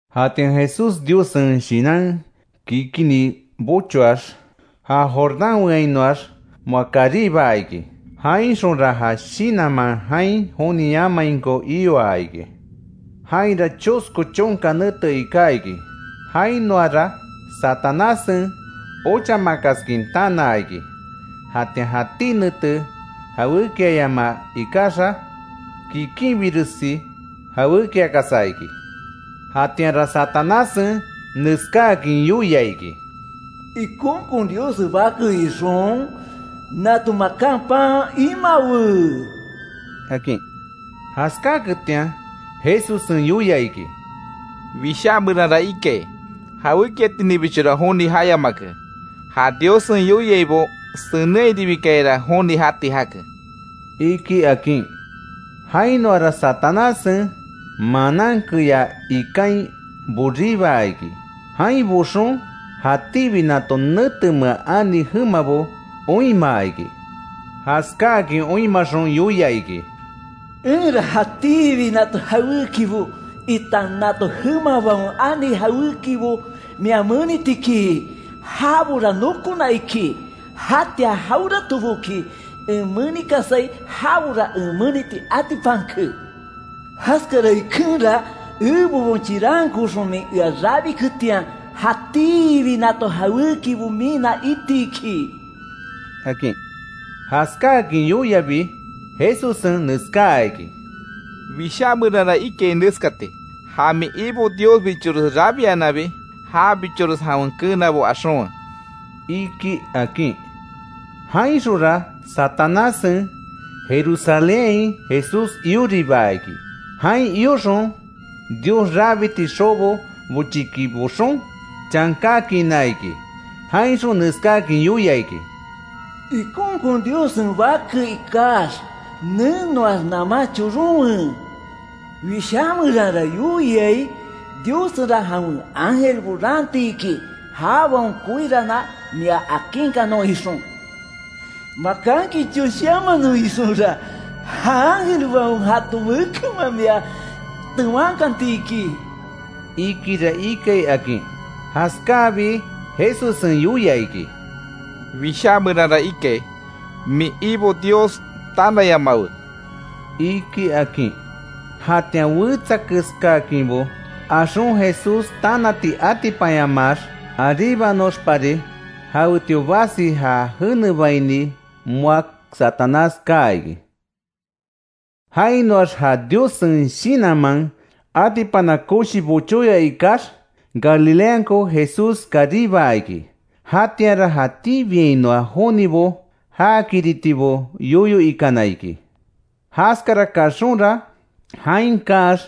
Jatian Jesús Diossen Shinan kikinni bochoax, ja Jordán weanhinoax, moa karibaa iki. Jainxonra ja Shinanman jain joni jayamainko ioa iki. Jainra chosko chonka nete iká iki, jainoara Satanássen ochamakaskin tanaa iki; jatian jatí nete jawékiama ikaxa kikinbiresi jawékiakasa iki. Jatianra Satanássen neskáakin yoia iki: —Ikonkon Diossen Bake ixon, nato makan pan imawe —akin. Jaskáaketian Jesussen yoia iki: —Wishá meranra ikai: ‘Jawékiatininbichora joni jayamake, [ja Diossen yoiaibo senenhairibikayara joni jati jake]’, iki —akin. Jainoara Satanássen manan keyá ikain boríbaa iki. Jain boxon, jatíbi nato netemea ani jemabo oinmaa iki. Jaskáakin oinmaxon yoia iki: —Enra jatíbi nato jawékibo, itan nato jemabaon ani jawékibo mia meniti iki. Jabora nokona iki, jatian jaweratoboki en menikasai jabora en meniti atipanke. Jaskara ikenra, ebebon chirankooxon min ea rabiketian, jatíbi nato jawékibo mina iti iki —akin. Jaskáakin yoiabi Jesussen neskáa iki: —Wishá meranra ikai neskati: ‘Ja min Ibo Diosbichores rabiananbi, jabichores jawen keenabo axonkanwe’, iki —akin. Jainxonra Satanássen Jerusalénhain Jesús ioribia iki. Jain ioxon Dios rabiti xobo bochiki boxon, chankakiina iki, jainxon neskáakin yoia iki: —Ikonkon Diossen Bake ikax nenoax naman choronwe; Wishá meranra yoiai: ‘Diossenra jawen ángelbo raanti iki; jabaon koiraanan mia akinkanon ixon. Makanki choshiamanon ixonra, ja ángelbaon jaton mekenman mia tewankanti iki’, ikira ikai —akin. Jaskáabi Jesussen yoia iki: —Wishá meranra ikai: ‘Min Ibo Dios tanayamawe’, iki —akin. Jatian wetsa keskáakinbo axon Jesús tanati atipanyamaax aríbanoxpari, jawetio basi já jenebaini moa Satanás kaa iki. Jainoax ja Diossen Shinanman atipana koshi bochóya ikax, Galileanko Jesús karibaa iki. Jatianra jatíbiainoa jonibo jakiritibo yoyo ikana iki. Jaskara kaxonra, jain kaax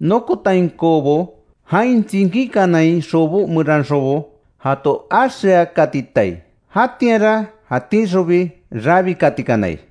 nokotainkobo, jain tsinkíkanai xobo meranxonbo, jato axeakatitai. Jatianra jatíxonbi rabikatikanai.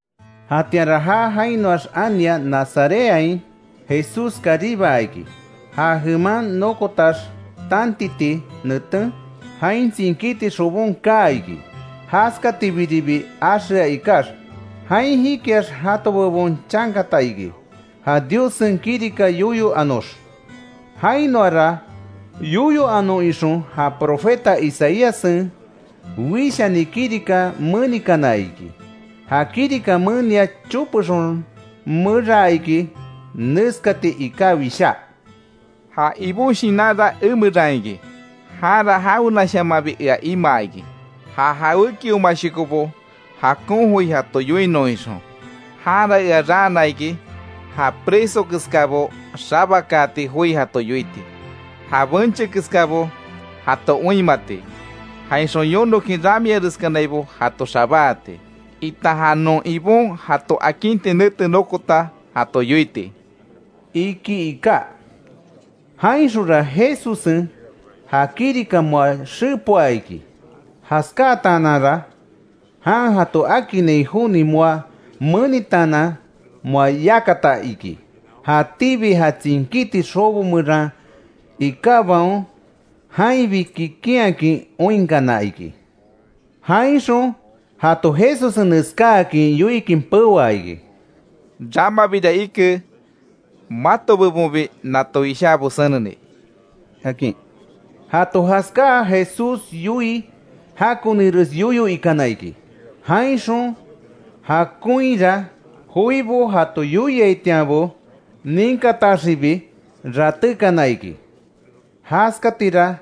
Jatianra já jainoax ania Nazarethain Jesús karibaa iki; ja jeman nokotax tantiti neten, jain tsinkíti xobon kaa iki, jaskatibiribi axea ikax. Jain jikiax jato bebon chankata iki, ja Diossen kirika yoyo anox. Jainoara yoyo anon ixon, ja profeta Isaíassen wishani kirika menikana iki. Ja kirika menia chopexon meraa iki, neskati iká wishá: “Ja Ibon Shinanra emeran iki; janra jawenashamanbi ea imaa iki, ja jawékiomashokobo, jakon joi jato yoinon ixon, janra ea raana iki, ja preso keskábo xabakaati, joi jato yoiti, ja benche keskabo jato oinmati; jainxon yonokin ramiareskanaibo jato xabáati, itan ja non Ibon jato akinti nete nokota jato yoiti”, iki iká. Jainxonra Jesussen ja kirika moa xepoa iki. Jaskátaananra, jan jato akinnai joni moa menitaanan moa yakata iki. Jatíbi ja tsinkíti xobo meran ikábaon, jainbi kikinhakin oinkana iki. Jainxon jato Jesussen neskáakin yoikin peoa iki: —Ramabira ike, mato bebonbi nato wishábo seneni —akin. Jato jaskáa, Jesús yoii jakonires yoyo ikana iki; jainxon jakonhira joibo jato yoiaitianbo, ninkataxibi ratékana iki. Jaskatira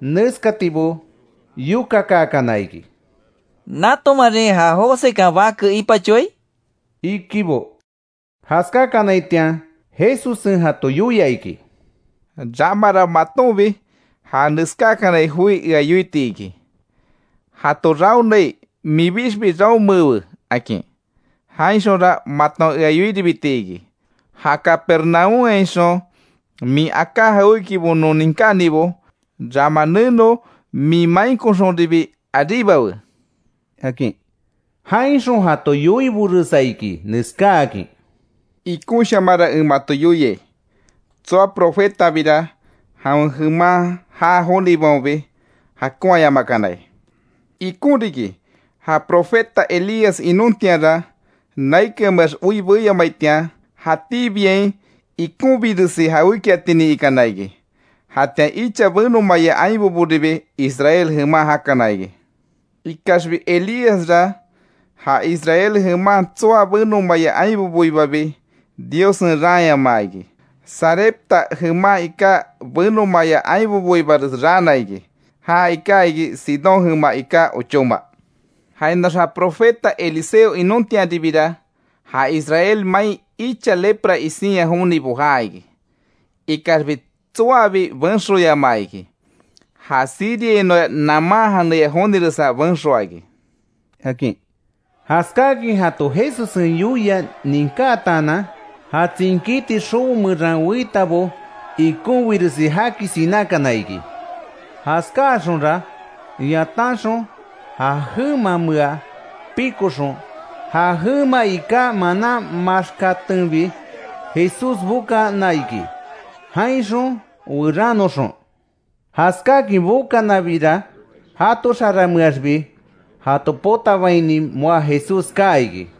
neskatibo yokakaakana iki: —¿Natomarin ja Josekan bake ipachoai? —ikibo. Jaskákanaitian Jesussen jato yoia iki: —Ramara matonbi, ja neskákanai joi ea yoiti iki: ‘Jato raonai, minbixbi raomeewe’, akin. Jainxonra maton ea yoiribiti iki: ‘Ja Capernaúmhainxon min aká jawékibo non ninkánibo; rama neno min mainkoxonribi aríbawe’ —akin. Jainxon jato yoiboresa iki, neskáakin: —Ikonshamanra en mato yoiai, tsoa profetabira jawen jeman jaa jonibaonbi jakonhayamakanai. Ikon riki, ja profeta Elías inontianra, naikanmeax oi beyamaitian, jatíbiain ikonbiresi jawékiatinin ikana iki. Jatian icha benomaya ainboboribi Israel jeman jakana iki. Ikaxbi Elíasra, ja Israel jeman tsoa benomaya ainboboibabi, Diossen raanyamaa iki; Sarepta jeman iká benomaaya ainboibares raana iki. Ja iká iki Sidón jema iká ochóma. Jainoax ja profeta Eliseo inontianribira, ja Israel main icha lepra isinya jonibo jaa iki. Ikaxbi tsoabi benxoyamaa iki; ja Siriainoa Naamán janeya joniresa benxoa iki —akin. Jaskáakin jato Jesussen yoia ninkátaanan, ja tsinkíti xobo meran weitabo, ikonbiresi jaki sinákana iki. Jaskáaxonra yatanxon, ja jemamea pikoxon, ja jema iká manan maxkatenbi Jesús bokana iki, jainxon werannoxon. Jaskáakin bokanabira jato xaranmeaxbi jato potabaini moa Jesús kaa iki.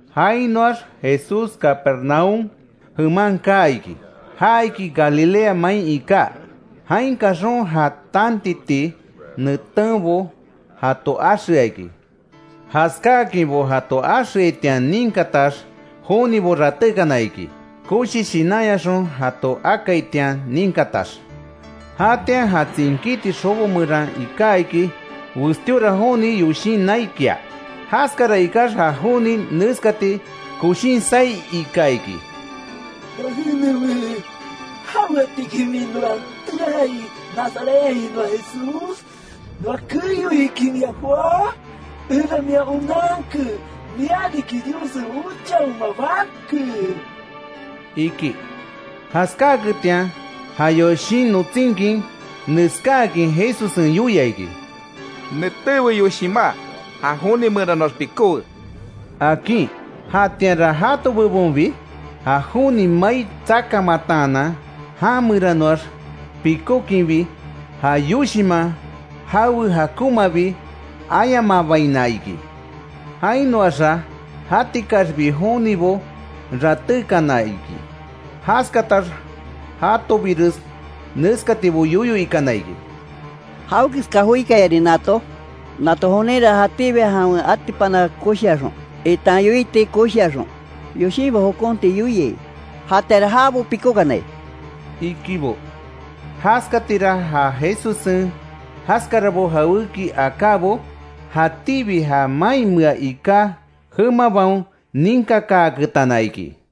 Jainoax Jesús Capernaúm jeman kaa iki, ja iki Galilea main iká. Jain kaxon ja tantiti netenbo jato axea iki. Jaskáakinbo jato axeaitian ninkatax, jonibo ratékana iki. Koshi shinanyaxon jato akaitian ninkatax. Jatian ja tsinkíti xobo meran iká iki, westíora joni yoshin naikia. Jaskara ikax, ja joni neskati koshin saí ika iki: —¡Noa jenewe! ¿Jaweatiki min noa teai Nazarethainoa Jesús? ¿Noa keyoiki mia joá? Enra mia onanke; mia riki Diossen ochaoma Bake —iki. Jaskáaketian ja yoshin notsinkin neskáakin Jesussen yoia iki: —¡Netéwe yoshimá, ja joni meranoax pikówe! —akin. Jatianra jato bebonbi ja joni mai tsakamataanan, jameranoax pikókinbi, ja yoshinman jawe jakonmabi ayamabaina iki. Jainoaxa jatikaxbi jonibo ratékana iki; jaskatax jatobires neskatibo yoyo ikana iki: —¿Jawekeska joikayarin nato? Nato joninra jatíbi jawen atipana koshiaxon, itan yoiti koshiaxon, yoshinbo jokonti yoiai; ¡Jatianra jabo pikókanai! —ikibo. Jaskatira ja Jesussen jaskara jawéki akábo, jatíbi ja mainmea iká jemabaon ninkakaaketana iki.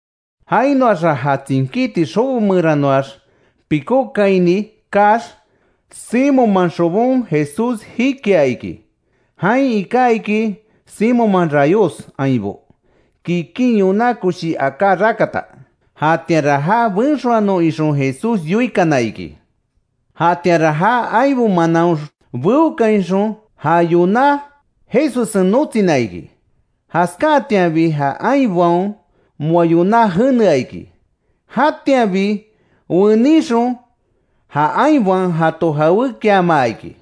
Jainoaxa ja tsinkíti xobo meranoax pikókaini kaax, Simonman xobon Jesús jikia iki. Jain iká iki, Simonman rayos ainbo kikin yoná koshi aká rakata. Jatianra ja benxoanon ixon Jesús yoikana iki. Jatianra ja ainbo manaon beokainxon ja yoná Jesussen notsina iki. Jaskáatianbi ja ainbaon moa yoná jenea iki. Jatianbi wenixon, ja ainbaon jato jawékiamaa iki.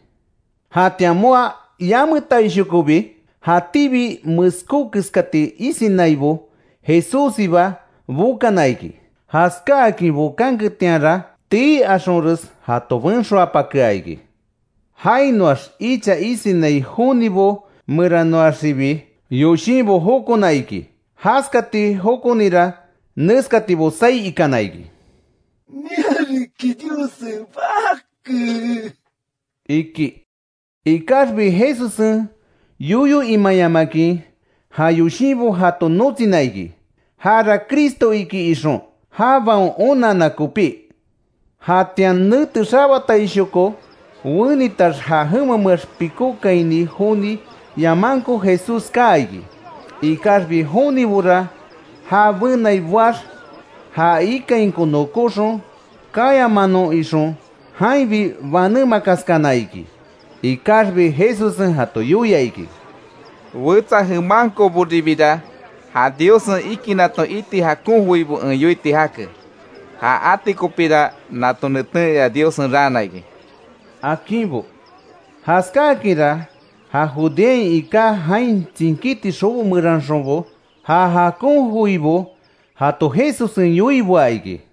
Jatian moa yametainshokobi, jatíbi meskó keskati isinaibo, Jesússiba bokana iki. Jaskáakin bokanketianra tii axonres jato benxoapakea iki. Jainoax icha isinai jonibo meranoaxibi, yoshinbo jokona iki. Jaskati jokonira neskatibo saí ikana iki: —¡Mia riki Diossen Bake! —iki. Ikaxbi Jesussen yoyo imayamakin ja yoshinbo jato notsina iki; jara Cristo iki ixon jabaon onanna kopí. Jatian nete xabataishoko wenitax, ja jemameax pikókaini joni yamanko Jesús kaa iki. Ikaxbi jonibora ja benai boax já ikainko nokóxon, kayamanon ixon jainbi banémakaskana iki. Ikaxbi Jesussen jato yoia iki: —Wetsa jemankoboribira ja Diossen ikinaton iti jakon joibo en yoiti jake; ja ati kopíra nato neten ea Diossen raana iki —akinbo. Jaskáakinra ja Judeain iká jain tsinkíti xobo meranxonbo, ja jakon joibo jato Jesussen yoiboa iki.